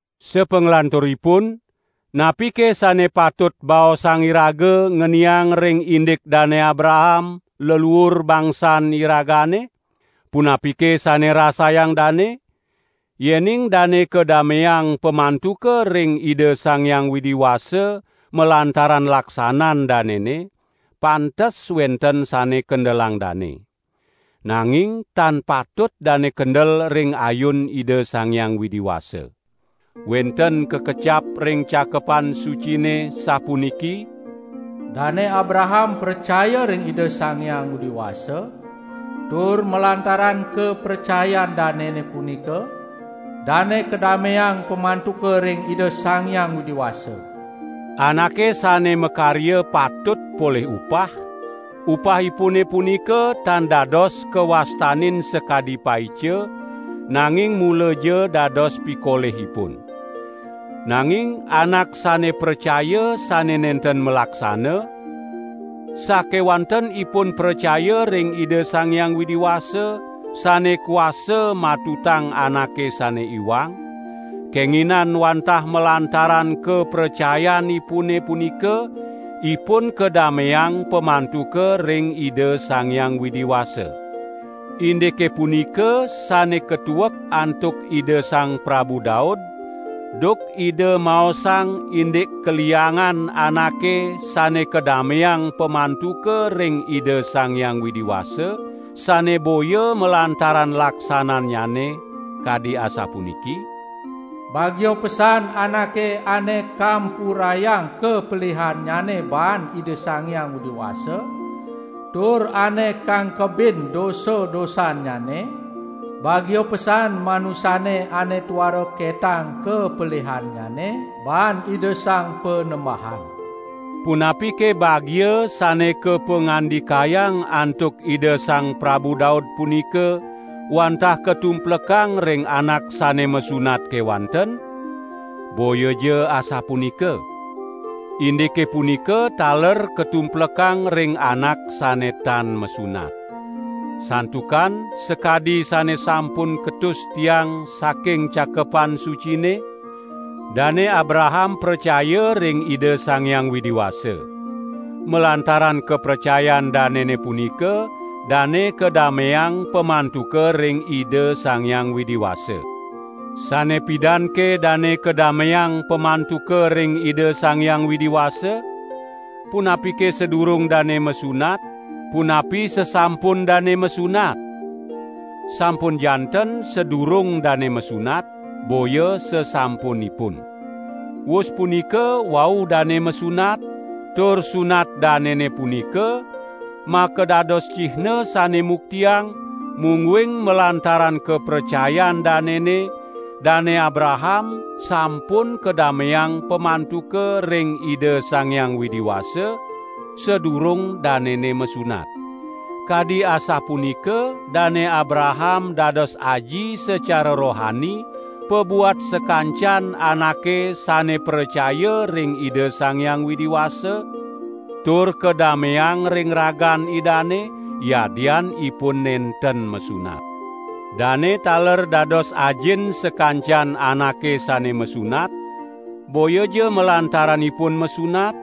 Sapanglanturipun, napike sane patut baosang iraga ngeniang ring indik Dane Abraham, leluur bangsan iragane? Punapike sane rasayang dane? Yening dane kadameang pamantuka ring Ida Sang Hyang Widi Wasa malantaran laksanan danene, pantes wenten sane kendelang dane. Nanging tan patut dane kendel ring ayun Ida Sang Hyang Widi Wasa. Wenten kakecap ring Cakepan Sucine sapuniki: "Dane Abraham pracaya ring Ida Sang Hyang Widi Wasa, tur malantaran kapracayan danene punika dane kadameang pamantuka ring Ida Sang Hyang Widi Wasa." Anake sane makarya patut polih upah; upahipune punika tan dados kawastanin sakadi paica, nanging mulaja dados pikolihipun. Nanging anak sane pracaya sane nenten malaksana, sakewanten ipun pracaya ring Ida Sang Hyang Widi Wasa sane kuasa matutang anake sane iwang, kenginan wantah malantaran kapracayanipune punika, ipun kadameang pamantuka ring Ida Sang Hyang Widi Wasa. Indike punika sane katuek antuk Ida Sang Prabu Daud duk ida maosang indik kaliangan anake sane kadameang pamantuka ring Ida Sang Hyang Widi Wasa, sane boya malantaran laksanannyane, kadi asapuniki: "Bagia pesan anake ane kampurayang kapelihannyane baan Ida Sang Hyang Widi Wasa, tur ane kangkebin dosa-dosannyane; bagia pesan manusane ane tuara ketang kapelihannyane baan Ida Sang Panembahan." Punapike bagia sane kapangandikayang antuk Ida Sang Prabu Daud punika wantah katumplekang ring anak sane masunat kewanten? Boyaja asapunika! Indike punika taler katumplekang ring anak sane tan masunat. Santukan sakadi sane sampun ketus tiang saking Cakepan Sucine: "Dane Abraham pracaya ring Ida Sang Hyang Widi Wasa. Malantaran kapracayan danene punika dane kadameang pamantuka ring Ida Sang Hyang Widi Wasa." Sane pidanke dane kadameang pamantuka ring Ida Sang Hyang Widi Wasa? Punapike sadurung dane masunat, punapi sasampun dane masunat? Sampun janten sadurung dane masunat, boya sasampunipun. Wus punika wau dane masunat, tur sunat danene punika makadados cihna sane muktiang, mungguing malantaran kapracayan danene, Dane Abraham sampun kadameang pamantuka ring Ida Sang Hyang Widi Wasa sadurung danene masunat. Kadi asapunika Dane Abraham dados aji sacara rohani pabuat sakancan anake sane pracaya ring Ida Sang Hyang Widi Wasa tur kadameang ring ragan Idane, yadian ipun nenten masunat. Dane taler dados ajin sakancan anake sane masunat, boyaja malantaran ipun masunat,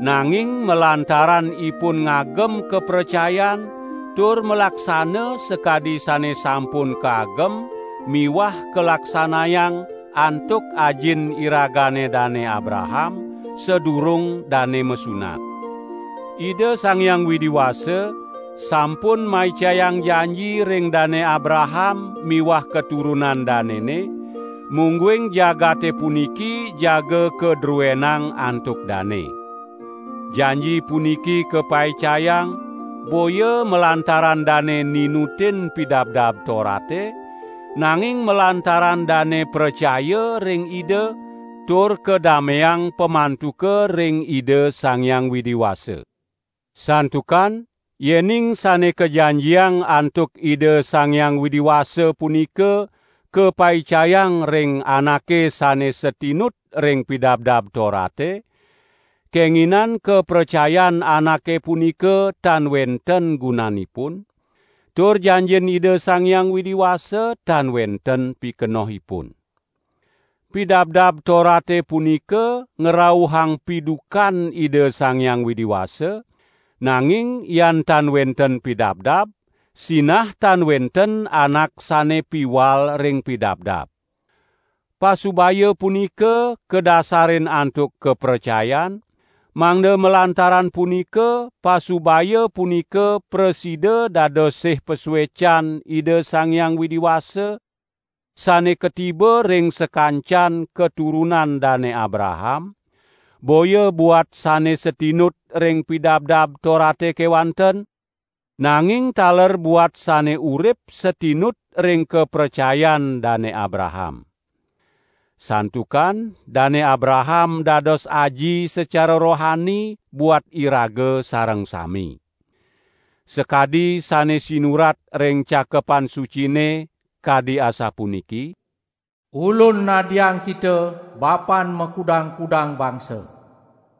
nanging malantaran ipun ngagem kapracayan tur malaksana sakadi sane sampun kaagem miwah kalaksanayang antuk ajin iragane Dane Abraham sadurung dane masunat. Ida Sang Hyang Widi Wasa sampun maicayang janji ring Dane Abraham miwah katurunan danene, mungguing jagate puniki jaga kadruenang antuk dane. Janji puniki kapaicayang, boya malantaran dane ninutin Pidabdab Torate, nanging malantaran dane pracaya ring Ida tur kadameang pamantuka ring Ida Sang Hyang Widi Wasa. Santukan yening sane kajanjiang antuk Ida Sang Hyang Widi Wasa punika kapaicayang ring anake sane satinut ring Pidabdab Torate, kenginan kapracayan anake punika tan wenten gunanipun, tur janjin Ida Sang Hyang Widi Wasa tan wenten pikenohipun. Pidabdab Torate punika ngrauhang pidukan Ida Sang Hyang Widi Wasa; nanging yan tan wenten pidabdab, sinah tan wenten anak sane piwal ring pidabdab. Pasubaya punika kadasarin antuk kapracayan, mangda malantaran punika pasubaya punika prasida dados sih pasuecan Ida Sang Hyang Widi Wasa sane katiba ring sakancan katurunan Dane Abraham, boya buat sane satinut ring Pidabdab Torate kewanten, nanging taler buat sane urip satinut ring kapracayan Dane Abraham. Santukan Dane Abraham dados aji sacara rohani buat iraga sareng sami. Sakadi sane sinurat ring Cakepan Sucine, kadi asapuniki: "Ulun nadiang kita bapan makudang-kudang bangsa."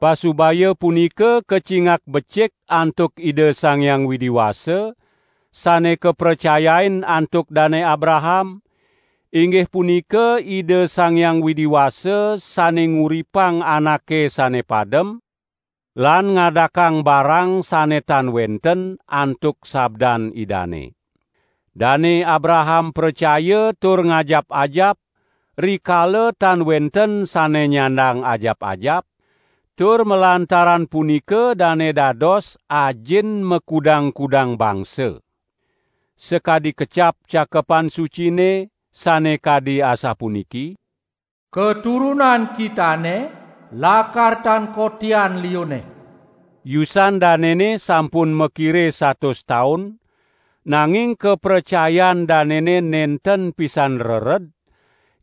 Pasubaya punika kacingak becik antuk Ida Sang Hyang Widi Wasa, sane kapracayain antuk Dane Abraham, inggih punika Ida Sang Hyang Widi Wasa sane nguripang anake sane padem lan ngadakang barang sane tan wenten antuk sabdan Idane. Dane Abraham pracaya tur ngajap-ajap, rikala tan wenten sane nyandang ajap-ajap, tur malantaran punika dane dados "ajin makudang-kudang bangsa". Sakadi kecap Cakepan Sucine, sane kadi asapuniki: "Katurunan kitane lakar tan kotian liunne." Yusan danene sampun makire satus taun; nanging kapracayan danene nenten pisan rered,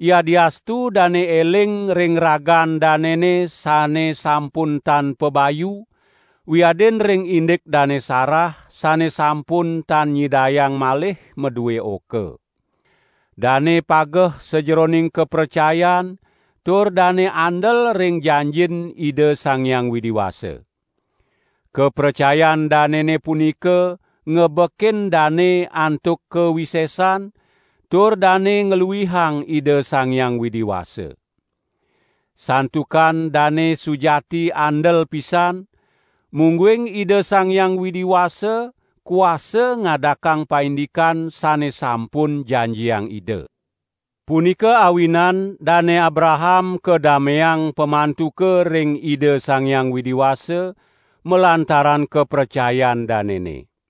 yadiastu dane eling ring ragan danene sane sampun tan pabayu, wiadin ring indik Dane Sarah sane sampun tan nyidayang malih madue oka. Dane pageh sajeroning kapracayan tur dane andel ring janjin Ida Sang Hyang Widi Wasa. Kapracayan danene punika ngebekin dane antuk kawisesan, tur dane ngluihang Ida Sang Hyang Widi Wasa. Santukan dane sujati andel pisan, mungguing Ida Sang Hyang Widi Wasa kuasa ngadakang paindikan sane sampun janjiang Ida. Punika awinan Dane Abraham kadameang pamantuka ring Ida Sang Hyang Widi Wasa, malantaran kapracayan danene.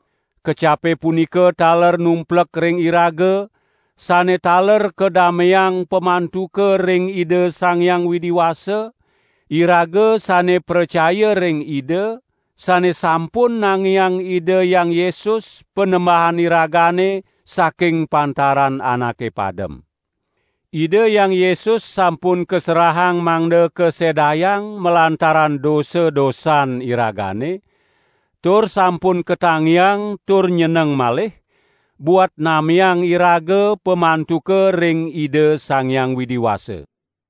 Kecape punika taler numplek ring iraga, sane taler kadameang pamantuka ring Ida Sang Hyang Widi Wasa, iraga sane pracaya ring Ida, sane sampun nangiang Ida Hyang Yesus, Panembahan iragane, saking pantaran anake padem. Ida Hyang Yesus sampun kaserahang mangda kasedayang malantaran dosa-dosan iragane, tur sampun katangiang tur nyeneng malih, buat nameang iraga pamantuka ring Ida Sang Hyang Widi Wasa.